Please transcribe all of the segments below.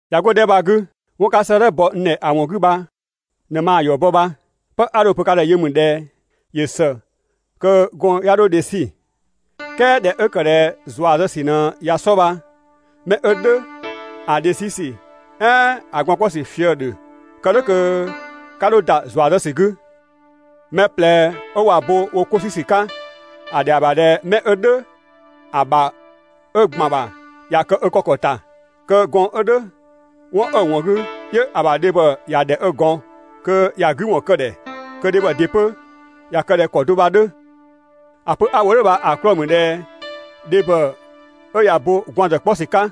꞊Ya 'go‑ 'dhɛ 'kö bha‑ 'gü, 'wɔn 'ka 'sëëdhɛ bɔ n ‑dhɛ ‑a ‑wɔn 'gü bha ꞊në maa‑ ‑yɔ bɔ bha. 'Pë 'a dho‑ pö ka ‑dhɛ yö ‑mü ꞊dhɛ: ‑Yö ‑së kö gɔɔn‑ 'ya 'dho dhe 'sü. "Kɛɛ ꞊dhɛ 'ö ‑kë ꞊dhɛ ‑zua zë ‑sü ꞊në ꞊ya 'sɔ bha, 'mɛ 'ö "dhʋ̈ ‑a dhe 'sü ‑sü "ɛɛn ‑a gwaan‑ 'kpɔ ‑sü fië‑ ‑dhö, kë "dhʋ̈ kö 'ka 'dho ‑da ‑zua zë ‑sü 'gü. Mɛ ꞊plɛ 'ö ꞊wa bo wo 'ko 'sü ‑sü 'ka, ‑a ‑dhɛa ‑bha ꞊dhɛ 'mɛ 'ö "dhʋ̈ ‑a ‑bha 'ö ‑gban ‑bha ‑ya kë ö kë ‑kɔ ‑ta. Kö gɔɔn‑ 'ö 'dhö 'wɔn 'ö‑ ‑wɔn 'gü 'yö‑ ‑bha dhebhɔ ‑ya ‑dhɛ 'ö ‑gɔn, kö ‑ya 'gü ‑wɔn kë‑ ‑dhɛ. Kö dhebhɔ ‑dɩ 'pö ‑ya kë ꞊dhɛ ‑kɔ do bha‑ 'dhö. ‑A pö 'a‑ wo "dhʋ̈ bha‑ 'klɔɔ‑ ‑mü ꞊dhɛ dhebhɔ 'ö ꞊ya bo gwaan‑ ‑zë 'kpɔ ‑sü 'ka,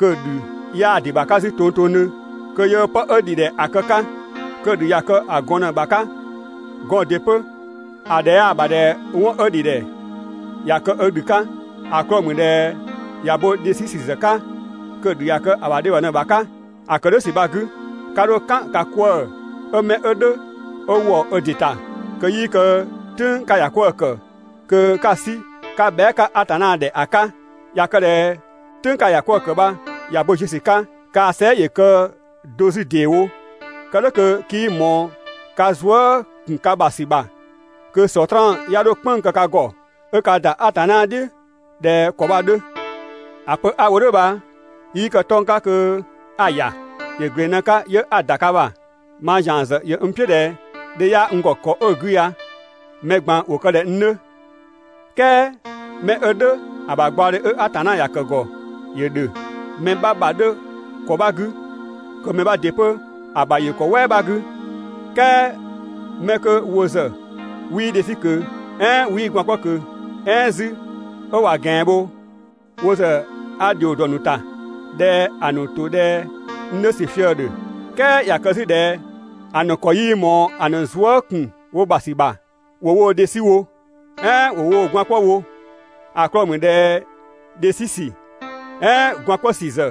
kö‑ ‑dhü 'yaa‑ ‑dɩ ‑bha 'ka 'zü tongtongdhö kö yöö 'pë 'ö ‑dhi ‑dhɛ ‑a kë‑ 'ka. Kö‑ ‑dhü ꞊ya kë‑ ‑bha gɔn ꞊në‑ ‑bha 'ka. Gɔɔn‑ ‑dɩ 'pö, ‑a ‑dhɛ 'yaa ‑bha ꞊dhɛ 'wɔn 'ö ‑dhidhɛ ‑ya kë ö ‑dhü 'ka, ‑a 'klɔɔ‑ ‑mü ꞊dhɛ ꞊ya bo dhe ‑zë ‑sü ‑sü 'ka kö‑ ‑dhü ꞊ya kë‑ ‑bha dhebhɔ ꞊në‑ ‑bha 'ka. ‑A ‑kë "dhʋ̈ ‑sü bha‑ 'gü, 'ka 'dho "kan ka 'kwëë‑ 'ö 'mɛ 'ö "dhʋ̈ 'ö ‑wɔ ö ‑dɩ ‑ta, kö 'yii kë "tʋ̈ng 'ka‑ ‑ya 'kwëë‑ ‑kë kö 'ka‑ 'sü 'ka bhɛa" 'ka Atanna ‑dhɛ ‑a 'ka. ꞊Ya kë ꞊dhɛ "tʋ̈ng 'ka‑ ‑ya 'kwëë‑ bha ꞊ya bo ziö ‑sü 'ka, kaa‑ sɛɛ" ‑yö kë do 'zü ‑deewo, kë "dhʋ̈ kö 'kii ꞊mɔɔ ka zuë" ‑kun ka ‑bha ‑sü ‑bha, kö Sɔtraan 'ya 'dho "kpënng‑ kë ka ‑gɔ ('ö 'ka ‑da Atanna "dhiʋ̈ ꞊dhɛ ‑kɔ bha‑ 'dhö). ‑A pö 'a‑ wo "dhʋ̈ bha 'yii kë 'tɔng‑ 'ka kö 'a‑ ‑ya. ‑Yö ‑gleng ꞊në‑ 'ka 'yö 'a‑ ‑da ka ‑bha. Mang ‑zian ‑zë ‑yö n "piʋ̈ 'nu ꞊dhɛ dhe 'yaa n ‑gɔ ‑kɔ 'ö‑ 'gü ya mɛ ꞊gban ‑wo kë ꞊dhɛ n 'dhö. "Kɛɛ 'mɛ 'ö "dhʋ̈ ‑a ‑bha gbaɔdhe 'ö Atanna ‑ya ‑kë ‑gɔ ‑yö ‑dhö. Mɛ 'bha ‑bha 'dhö ‑kɔ 'bha 'gü, kö mɛ 'bha ‑dɩ 'pö‑ ‑bha ‑yö ‑kɔ "wɛɛ 'bha 'gü. "Kɛɛ 'mɛ 'kö wo ‑zë 'wii dhe 'sü ꞊kö, "ɛɛn 'ö 'wii gwaan‑ 'kpɔ ꞊kö "ɛɛn 'zü 'ö ꞊wa ꞊gɛan bho, wo ‑zë a ‑dhio ‑dɔ ‑nu ‑ta, ꞊dhɛ ‑a ‑nu ‑to ꞊dhɛ n 'dhö ‑sü fië‑ ‑dhö. "Kɛɛ ꞊ya kë 'zü ꞊dhɛ ‑a ‑nu ‑kɔ 'yii ꞊mɔɔ‑ ‑nu zuë" ‑kun wo ‑bha ‑sü ‑bha, ‑wo woo‑ dhe 'sü wo, "ɛɛn ‑wo woo‑ gwaan‑ 'kpɔ wo. ‑A 'klɔɔ‑ ‑mü ꞊dhɛ dhe 'sü ‑sü, "ɛɛn gwaan‑ 'kpɔ ‑sü ‑zë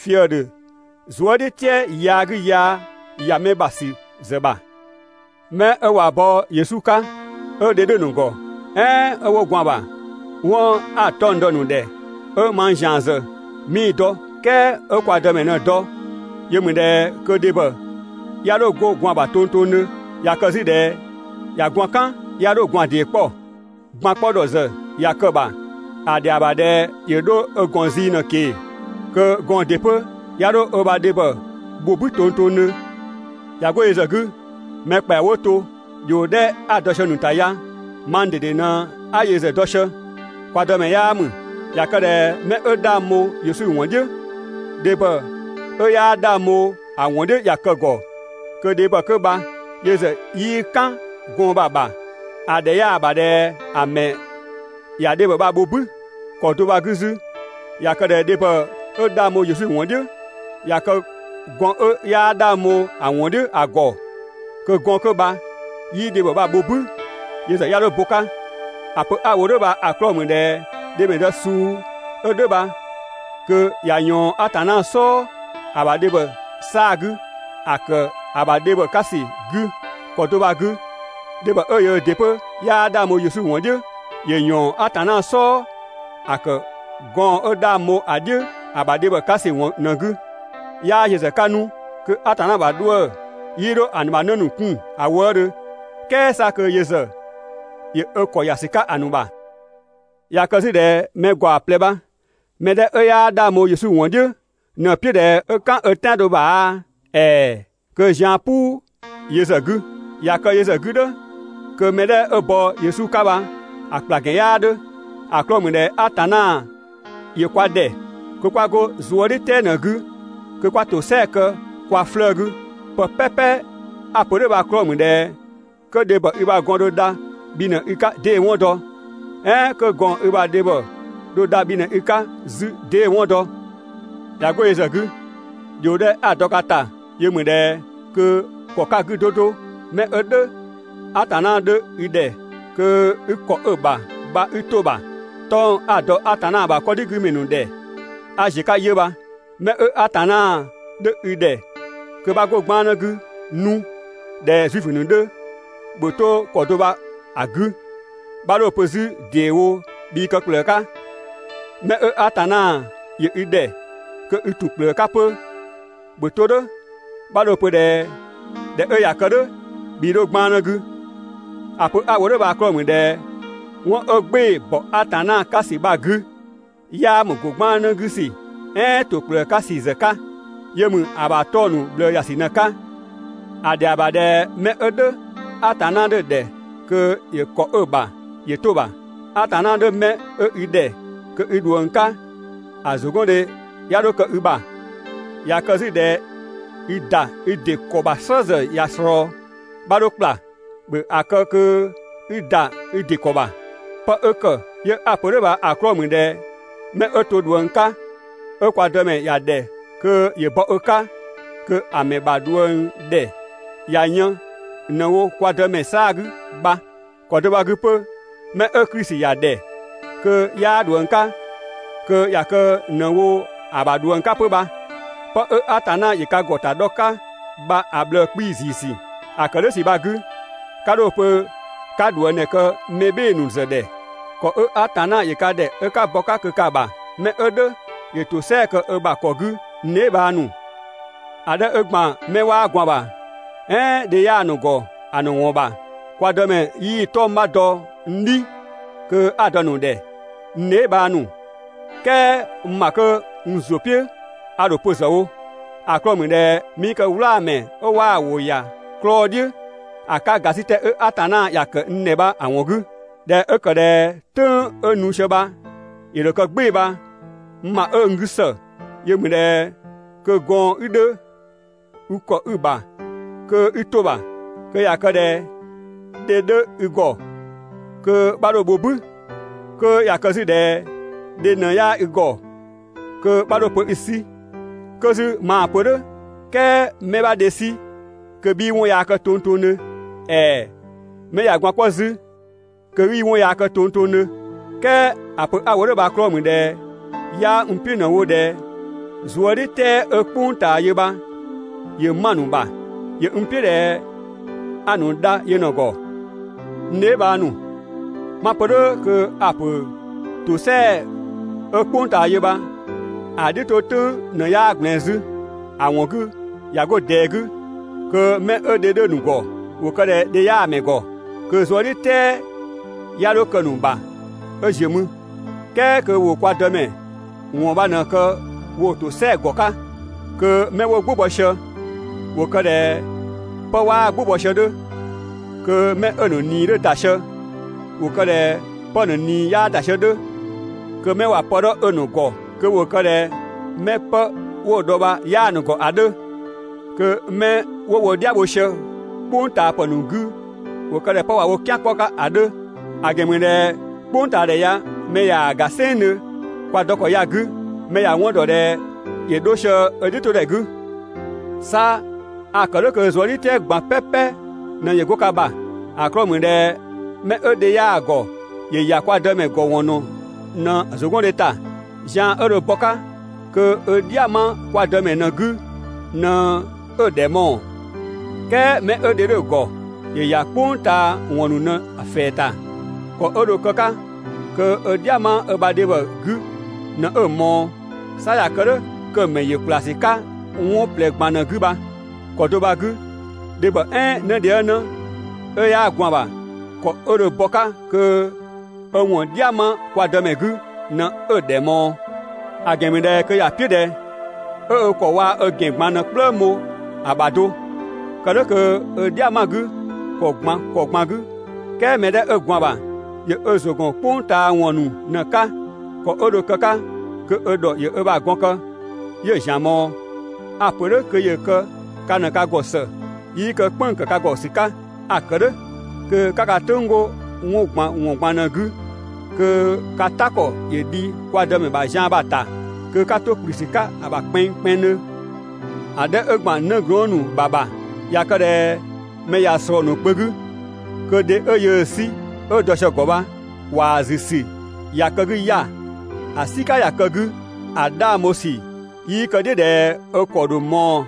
fië‑ ‑dhö zuëdhiʋ̈tɛɛ yaa 'gü yaa ‑ya mɛ ‑bha ‑sü ‑zë ‑bha. 'Mɛ 'ö ꞊wa bo bɔ ‑sü 'ka Yesu 'ka, 'ö dhe 'dhö‑ ‑nu ‑gɔ "ɛɛn 'ö 'wo gwaan‑ ‑bha, 'wɔn 'a‑ 'tɔng‑ dɔ‑ ‑nu ‑dhɛ ('ö mang ‑zian ‑zë 'mii‑ dɔ "kɛɛ 'ö kwa Dëmɛ ꞊në‑ dɔ), yö ‑mü ꞊dhɛ kö dhebhɔ 'ya 'dho 'go gwaan‑ ‑bha tongtongdhö. ꞊Ya kë 'zü ꞊dhɛ ꞊ya gwaan‑ "kan, 'ya 'dho gwaan‑ ‑dee 'kpɔ. Gwaan‑ 'kpɔ ‑dhɔ ‑zë ꞊ya kë‑ ‑bha, ‑a ‑dhɛa ‑bha ꞊dhɛ ‑yö 'dho ö ‑gɔn zii ꞊në‑ ꞊kee‑. Kö gɔɔn‑ ‑dɩ 'pö 'ya 'dho ö ‑bha dhebhɔ bho "bü tongtongdhö. ꞊Ya 'go yö ‑zë 'gü, mɛ ‑kpɛa 'wo to, ‑dhio 'dhɛ 'a‑ dɔ sië‑ ‑nu ‑ta ya (mang ꞊dede ꞊në 'a yö ‑zë dɔ sië, kwa Dëmɛ 'yaa ‑mü), ꞊ya kë ꞊dhɛ 'mɛ 'ö 'dhang bho Yesu ‑wɔn "dhiʋ̈, dhebhɔ 'ö 'yaa 'dhang bho‑ ‑wɔn "dhiʋ̈ ꞊ya kë‑ ‑gɔ, kö‑ dhebhɔ 'kö bha yö ‑zë 'yii "kan gɔɔn‑ bha‑ ‑bha, ‑a ‑dhɛ 'yaa‑ ‑bha ꞊dhɛ ‑a ‑mɛ ‑ya dhebhɔ bha‑ bho "bü. ‑Kɔ do bha‑ 'gü 'zü, ꞊ya kë ꞊dhɛ dhebhɔ 'ö 'dhang bho Yesu ‑wɔn "dhiʋ̈ ꞊ya kë gɔɔn‑ 'ö 'yaa 'dhang bho‑ ‑wɔn "dhiʋ̈ ‑a ‑gɔ, kö gɔɔn‑ 'kö bha 'yii‑ dhebhɔ bha‑ bho "bü, yö ‑zë 'ya 'dho bo‑ 'ka. ‑A pö 'a‑ wo "dhʋ̈ bha‑ 'klɔɔ‑ ‑mü ꞊dhɛ dhemɛdë suu 'ö "dhʋ̈ bha kö ꞊ya ꞊yɔɔn Atanna "sɔɔ ‑a ‑bha dhebhɔ 'saa‑ 'gü ‑a ‑kë ‑a ‑bha dhebhɔ 'ka ‑sü 'gü. ‑Kɔ do bha‑ 'gü, dhebhɔ 'ö yöö ‑dɩ 'pö 'yaa 'dhang bho Yesu ‑wɔn "dhiʋ̈, ‑yö ‑yɔɔn Atanna "sɔɔ ‑a ‑kë gɔɔn‑ 'ö 'dhang bho‑ "dhiʋ̈ ‑a ‑bha dhe 'ka ‑sü ‑wɔn ꞊në‑ 'gü. 'Yaa yö ‑zë 'ka 'nu kö Atanna ‑bha 'dhuë‑ 'yii 'dho‑ ‑nu ‑bha 'në ‑nu 'kun ‑a wëëdhö, "kɛɛ 'sa kö yö ‑zë ‑yö ö ‑kɔ ‑ya ‑sü 'ka‑ ‑nu ‑bha. ꞊Ya kë 'zü ꞊dhɛ mɛ ‑gaɔ ꞊plɛ bha‑ mɛ 'dhɛ 'ö 'yaa 'dhang bho Yesu ‑wɔn "dhiʋ̈ ꞊në‑ "piʋ̈ ꞊dhɛ 'ö "kan ö "tɛado ‑bha aa, ‑ɛɛ! kö zian‑ "puu yö ‑zë 'gü. ꞊Ya kë yö ‑zë 'gü "dhʋ̈, kö mɛ 'dhɛ 'ö bɔ Yesu 'ka bha‑ ‑kpla ‑gɛn 'yaa 'dhö. ‑A 'klɔɔ‑ ‑mü ꞊dhɛ Atanna ‑yö kwa ‑dhɛ kö 'kwa 'go zuëdhiʋ̈tɛɛ ꞊në‑ 'gü kö 'kwa ‑tosɛa kë kwa 'flëë‑ 'gü. Pë "pɛpɛ 'a‑ pö "dhʋ̈ bha‑ 'klɔɔ‑ ‑mü ꞊dhɛ 'kö dhebhɔ i ‑bha gɔn dho dha bhi ꞊në i 'ka 'dee‑ 'wɔn dɔ? "Ɛɛn 'kö gɔɔn‑ i ‑bha dhebhɔ dho dha bhi ꞊në i 'ka 'zü, 'dee‑ 'wɔn dɔ? ꞊Ya 'go yö ‑zë 'gü, ‑dhio 'dhɛ 'a‑ dɔ ka ‑ta yö ‑mü ꞊dhɛ kö ‑kɔ 'ka‑ 'gü 'do 'do, 'mɛ 'ö "dhʋ̈ Atanna 'dhö i ‑dhɛ kö i ‑kɔ 'ö‑ ‑bha bha 'i 'to‑ ‑bha. 'Tɔng‑ 'a‑ dɔ Atanna ‑bha 'kɔdhigümɛ ‑nu ‑dhɛ 'a ‑ziö 'ka 'yö bha. 'Mɛ 'ö Atanna 'dhö i ‑dhɛ kö 'bha 'go 'gbannë 'gü 'nu ꞊dhɛ Zuifö ‑nu 'dhö, ‑bhö 'to ‑kɔ bha‑ 'gü 'bha 'dho‑ pö 'zü ‑deewo bhii kë ‑kplëë 'ka. 'Mɛ 'ö Atanna ‑yö i ‑dhɛ kö i ‑tun ‑kplëë 'ka 'pö, ‑bhö 'to "dhʋ̈, 'bha 'dho‑ pö ꞊dhɛ ꞊dhɛ 'ö ꞊ya kë "dhʋ̈ bhii 'dho 'gbannë 'gü. ‑A pö 'a‑ wo "dhʋ̈ bha‑ 'klɔɔ‑ ‑mü ꞊dhɛ 'wɔn 'ö "gbɩɩ‑ ‑bɔ Atanna 'ka ‑sü bha‑ 'gü 'yaa ‑mü ‑go 'gbannë 'gü ‑sü "ɛɛn ‑to ‑kplëë 'ka ‑sü ‑zë 'ka. Yö ‑mü ‑a ‑bha 'tɔng‑ ‑nu ꞊bhlëë ‑ya ‑sü ꞊në‑ 'ka. ‑A ‑dhɛa ‑bha ꞊dhɛ 'mɛ 'ö "dhʋ̈ Atanna 'dhö‑ ‑dhɛ kö ‑yö ‑kɔ 'ö‑ ‑bha 'yö 'to‑ ‑bha. Atanna 'dhö 'mɛ 'ö i ‑dhɛ kö i ꞊dhuëng 'ka, ‑a ‑zʋgɔndhe 'ya 'dho kë i ‑bha. ꞊Ya kë 'zü ꞊dhɛ i ‑da i ‑dɩ ‑kɔ ‑bha "slë ‑zë ꞊ya ꞊slɔɔ, 'bha 'dho ‑kpla, ‑bhö ‑a kë kö i ‑da i ‑dɩ ‑kɔ ‑bha. 'Pë 'ö ‑kë 'yö 'a‑ pö "dhʋ̈ bha‑ 'klɔɔ‑ ‑mü ꞊dhɛ 'mɛ 'ö to ꞊dhuëng 'ka 'ö kwa Dëmɛ ‑ya ‑dhɛ kö ‑yö bɔ ö 'ka, kö‑ ‑mɛ ‑bha ꞊dhuëngdhɛ ꞊ya yën ꞊në‑ wo kwa Dëmɛ 'saa‑ 'gü bha. ‑Kɔ do bha‑ 'gü 'pö 'mɛ 'ö Klisi ‑ya ‑dhɛ kö 'yaa ꞊dhuëng 'ka, kö ꞊ya kë ꞊në‑ wo‑ ‑bha ꞊dhuëng 'ka 'pö bha. 'Pë 'ö Atanna ‑yö ka ‑gɔ ‑ta dhɔ‑ 'ka bha‑ ꞊bhlëë‑ 'kpii‑ ‑ziisü. ‑A ‑kë "dhʋ̈ ‑sü bha‑ 'gü, 'ka 'dho‑ pö 'ka ꞊dhuëngdhɛ kë mɛ "bhɩɩ‑ ‑nu ‑zë ‑dhɛ. ‑Kɔ 'ö Atanna ‑yö ka ‑dhɛ 'ö 'ka bɔ‑ 'ka kö ka‑ ‑bha, 'mɛ 'ö "dhʋ̈ ‑yö ‑tosɛa kë ö ‑bha ‑kɔ 'gü n dheebhang ‑nu. ‑A 'dhɛ 'ö ‑gban 'mɛ 'waa gwaan‑ ‑bha "ɛɛn 'ö dhe 'yaa‑ ‑nu ‑gɔ ‑a ‑nu ‑wɔn ‑bha, kwa Dëmɛ 'yii 'tɔng‑ 'bha dɔ n "dhi kö 'a‑ dɔ‑ ‑nu ‑dhɛ, n dheebhang ‑nu. "Kɛɛ n ‑bha kö n ‑zʋ "piʋ̈ a ‑dho pö ‑zë wo, ‑a 'klɔɔ‑ ‑mü ꞊dhɛ 'mii kë "wlaa‑ mɛ 'ö 'waa‑ ‑wʋ ‑ya 'klɔɔ‑ "dhiʋ̈ ‑a 'ka ‑gasitɛ 'ö Atanna ‑ya ‑kë n ‑dhɛ bha‑ ‑wɔn 'gü. ꞊Dhɛ 'ö ‑kë ꞊dhɛ "tʋ̈ng 'ö nu sië bha ‑yö ‑dho kë "gbɩɩ‑ bha, n ‑bha 'ö n 'gü ‑së yö ‑mü ꞊dhɛ kö gɔɔn‑ 'i 'dhö, 'i ‑kɔ 'ö‑ ‑bha kö 'i 'to‑ ‑bha. 'Kö ꞊ya kë ꞊dhɛ dhe 'dhö i ‑gɔ, kö 'bha 'dho‑ bho "bü. 'Kö ꞊ya kë 'zü ꞊dhɛ dhe ꞊në 'yaa i ‑gɔ, kö 'bha 'dho‑ pö 'i‑ 'sü. 'Kö 'zü maa‑ pö "dhʋ̈, "kɛɛ 'mɛ 'bha dhe 'sü kö 'bhii 'wɔn yaa kë tongtongdhö, ‑ɛɛ 'mɛ ꞊ya gwaan‑ 'kpɔ 'zü kö 'yii 'wɔn yaa kë tongtongdhö. "Kɛɛ ‑a pö 'a‑ wo "dhʋ̈ bha‑ 'klɔɔ‑ ‑mü ꞊dhɛ 'yaa n "piʋ̈ ꞊në‑ wo ꞊dhɛ zuëdhiʋ̈tɛɛ 'ö "kpʋng ꞊taa yö bha ‑yö 'ma‑ ‑nu ‑bha. ‑Yö n "piʋ̈ ꞊dhɛ 'a‑ ‑nu dha yö ꞊në‑ ‑gɔ. N dheebhang ‑nu, 'ma‑ pö "dhʋ̈ kö a‑ ‑pö ‑tosɛa 'ö "kpʋng ꞊taa yö bha‑ "dhiʋ̈ 'to "tʋ̈ng ꞊në 'yaa ꞊gblɛɛn 'zü. ‑A ‑wɔn 'gü ꞊ya 'go ꞊dɛɛ 'gü, kö 'mɛ 'ö dhe 'dhö‑ ‑nu ‑gɔ ‑wo kë ꞊dhɛ dhe 'yaa mɛ ‑gɔ, kö‑ zuëdhiʋ̈tɛɛ 'ya 'dho kë‑ ‑nu ‑bha 'ö ‑ziö mü. ("Kɛɛ kö ‑wo kwa Dëmɛ ‑wɔn bha ꞊në‑ kë woo‑ ‑tosɛa ‑gɔ 'ka). Kö 'mɛ 'wo "gbʋ bɔ sië ‑wo kë ꞊dhɛ 'pë 'waa "gbʋ bɔ sië‑ 'dhö, kö 'mɛ 'ö‑ ‑nu ꞊nii 'dhö ‑da sië ‑wo kë ꞊dhɛ 'pë‑ ‑nu ꞊nii 'yaa ‑da sië‑ 'dhö. Kö 'mɛ ꞊wa pë 'dhɔ 'ö‑ ‑nu ‑gɔ kö ‑wo kë ꞊dhɛ 'mɛ 'pë 'wo‑ dhɔ bha 'yaa‑ ‑nu ‑gɔ ‑a 'dhö. Kö 'mɛ 'wo wo "dhia bho sië "kpʋngtaapë ‑nu 'gü ‑wo kë ꞊dhɛ 'pë ꞊wa wo "kian 'kpɔ‑ 'ka ‑a 'dhö, ‑a ‑gɛn ‑mü ꞊dhɛ "kpʋngtaadhɛ ya mɛ ꞊yaa‑ ‑ga "sɛnngdhö kwa dɔ ‑kɔ ya‑ 'gü, mɛ ‑ya 'wɔn ‑dɔ ꞊dhɛ ‑yö 'dho sië ö "dhiʋ̈todhɛ 'gü. 'Sa a‑ ‑kë "dhʋ̈ kö zuëdhiʋ̈tɛɛ ꞊gban "pɛpɛ ꞊në ‑yö 'go ka ‑bha. ‑A 'klɔɔ‑ ‑mü ꞊dhɛ 'mɛ 'ö dhe 'yaa‑ ‑gɔ ‑yö ‑ya kwa Dëmɛ ‑gɔ ‑wɔn ‑nu ꞊në ‑zʋgɔndhe ‑ta. Zian 'ö dho bɔ‑ 'ka kö ö "dhia‑ 'ma kwa Dëmɛ ꞊në‑ 'gü ꞊në 'ö‑ ‑dhɛ ‑mɔɔ. "Kɛɛ 'mɛ 'ö dhe 'dhö‑ ‑gɔ, ‑yö ‑ya "kpʋng ꞊taa ‑wɔn ‑nu ꞊në‑ ‑fɛɛ ‑ta, ‑kɔ 'ö dho kë‑ 'ka kö ö "dhia‑ 'ma ö ‑bha dhebhɔ 'gü ꞊në 'ö‑ ꞊mɔɔ. 'Sa ꞊ya kë "dhʋ̈ kö‑ ‑mɛ ‑yö ‑kplasü 'ka 'wɔn ꞊plɛ ꞊gban ꞊në‑ 'gü bha. ‑Kɔ do bha‑ 'gü, dhebhɔ "ɛɛn 'nëdhiëngnë 'ö 'yaa gwaan‑ ‑bha, ‑kɔ 'ö dho bɔ‑ 'ka kö ö ‑wɔn "dhia‑ 'ma kwa Dëmɛ 'gü ꞊në 'ö‑ ‑dhɛ ꞊mɔɔ. ‑A ‑gɛn ‑mü ꞊dhɛ kö ‑ya "piʋ̈ ꞊dhɛ 'ö ö ‑kɔ waa‑ ö ‑gɛn ꞊gban ꞊në‑ "kplëng bho‑ ‑bha do, kë "dhʋ̈ kö 'ö "dhia‑ 'ma‑ 'gü ‑kɔ ꞊gban ‑kɔ ꞊gban 'gü. "Kɛɛ mɛ 'dhɛ 'ö gwaan‑ ‑bha ‑yö ö ‑zʋ ‑gɔn "kpʋng ꞊taa ‑wɔn ‑nu ꞊në‑ 'ka, ‑kɔ 'ö dho‑ kë‑ 'ka kö ö ‑dhɔ ‑yö ö ‑bha gɔn kë 'yö‑ ‑zian ꞊mɔɔ. A‑ ‑pö "dhʋ̈ kö ‑yö kë ka ꞊në ka ‑gɔ ‑së, 'yii kë "kpënng‑ ‑kë ka ‑gɔ ‑sü 'ka. A‑ ‑kë "dhʋ̈ kö 'ka ka "tʋ̈ng 'go 'wɔn ꞊gban ‑wɔn ꞊gban ꞊në‑ 'gü kö ka "ta ‑kɔ ‑yö dhi kwa Dëmɛ ‑bha zian bha‑ ‑ta, kö 'ka 'to ‑kplü ‑sü 'ka‑ ‑bha kpɛnngkpɛnngdhö. ‑A 'dhɛ 'ö ‑gban 'nëglɔɔn ‑nu ‑bha ‑bha, ꞊ya kë ꞊dhɛ mɛ ꞊ya ꞊slɔɔ‑ ‑nu kpö 'gü kö dhe 'ö yöö‑ 'sü 'ö dɔ sië‑ ‑gɔ bha, ‑kwaa ‑zü ‑sü ꞊ya kë‑ 'gü 'ya‑, ‑a "sika ꞊ya kë‑ 'gü, ‑a 'dhang bho ‑sü 'yii kë‑ "dhiʋ̈ ꞊dhɛ 'ö ‑kɔ ‑dho ꞊mɔɔ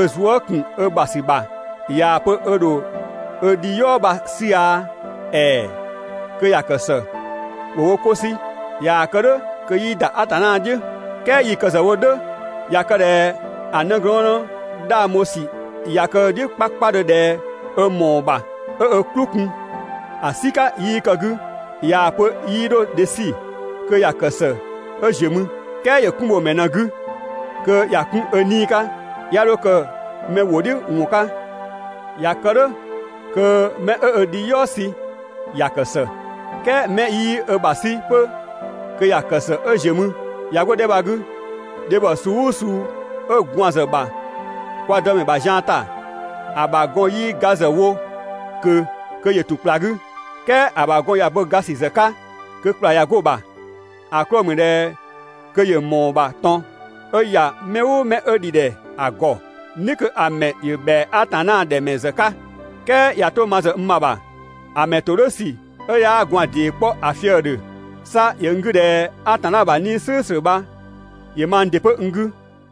ö zuë" ‑kun ö ‑bha ‑sü ‑bha, ꞊yaa‑ pö ö ‑dho ö dhi "yɔɔ bha‑ 'sü aa, ‑ɛɛ! Kö ‑ya ‑kë ‑së, ‑wo wo 'ko 'sü. ꞊Yaa‑ kë "dhʋ̈ kö 'yii ‑da Atanna "dhiʋ̈. "Kɛɛ 'yii kë ‑zë wo "dhʋ̈, ꞊ya kë ꞊dhɛ ‑a 'nëglɔɔnnë 'dhang bho ‑sü ꞊ya kë‑ "dhiʋ̈ 'kpakpadhö ꞊dhɛ 'ö ‑mɔɔ ‑bha 'ö ö "klʋ kun, ‑a "sika 'yii kë‑ 'gü, ꞊yaa‑ pö 'yii 'dho dhe 'sü, kö ‑ya ‑kë ‑së 'ö ziö mü. "Kɛɛ ‑yö 'kun bho‑ ‑mɛ ꞊në‑ 'gü kö ‑ya 'kun ö 'nii‑ 'ka, 'ya 'dho kë mɛ ‑wʋ "dhiʋ̈ ‑wɔn 'ka. ꞊Ya kë "dhʋ̈, kö 'mɛ 'ö ö dhiyɔɔ sü ‑ya ‑kë ‑së. "Kɛɛ 'mɛ 'yii ö ‑bha 'sü 'pö kö ‑ya ‑kë ‑së 'ö ‑ziö mü. ‑Ya 'go‑ 'dhɛ bha‑ 'gü, dhebhɔ suu "ʋʋ suu 'ö gwaan‑ ‑zë ‑bha kwa Dëmɛ ‑bha zian ‑ta, ‑a ‑bha gɔn 'yii ga ‑zë wo ꞊kö kö ‑yö ‑tun ‑kpla 'gü. "Kɛɛ ‑a ‑bha gɔn ꞊ya bo ga ‑sü ‑zë 'ka kö ‑kpla ꞊ya 'go‑ ‑bha. ‑A 'klɔɔ‑ ‑mü ꞊dhɛ kö ‑yö ‑mɔɔ ‑bha ꞊tɔn 'ö ‑ya mɛ "ʋʋ mɛ 'ö ‑dhidhɛ ‑a ‑gɔ, "ni kö‑ ‑mɛ ‑yö ‑bhɛa Atanna ‑dhɛ ‑mɛ ‑zë 'ka. "Kɛɛ ꞊ya 'to ma ‑zë n ‑bha ‑bha, ‑a ‑mɛ ‑todhʋ̈sü 'ö 'yaa gwaan‑ ‑dee 'kpɔ ‑a fië‑ ‑dhö. 'Sa ‑yö n 'gü ꞊dhɛ Atanna ‑bha 'Nii‑ "slʋ̈ʋ̈slʋ̈ bha ‑yö mang ‑dɩ 'pö n 'gü.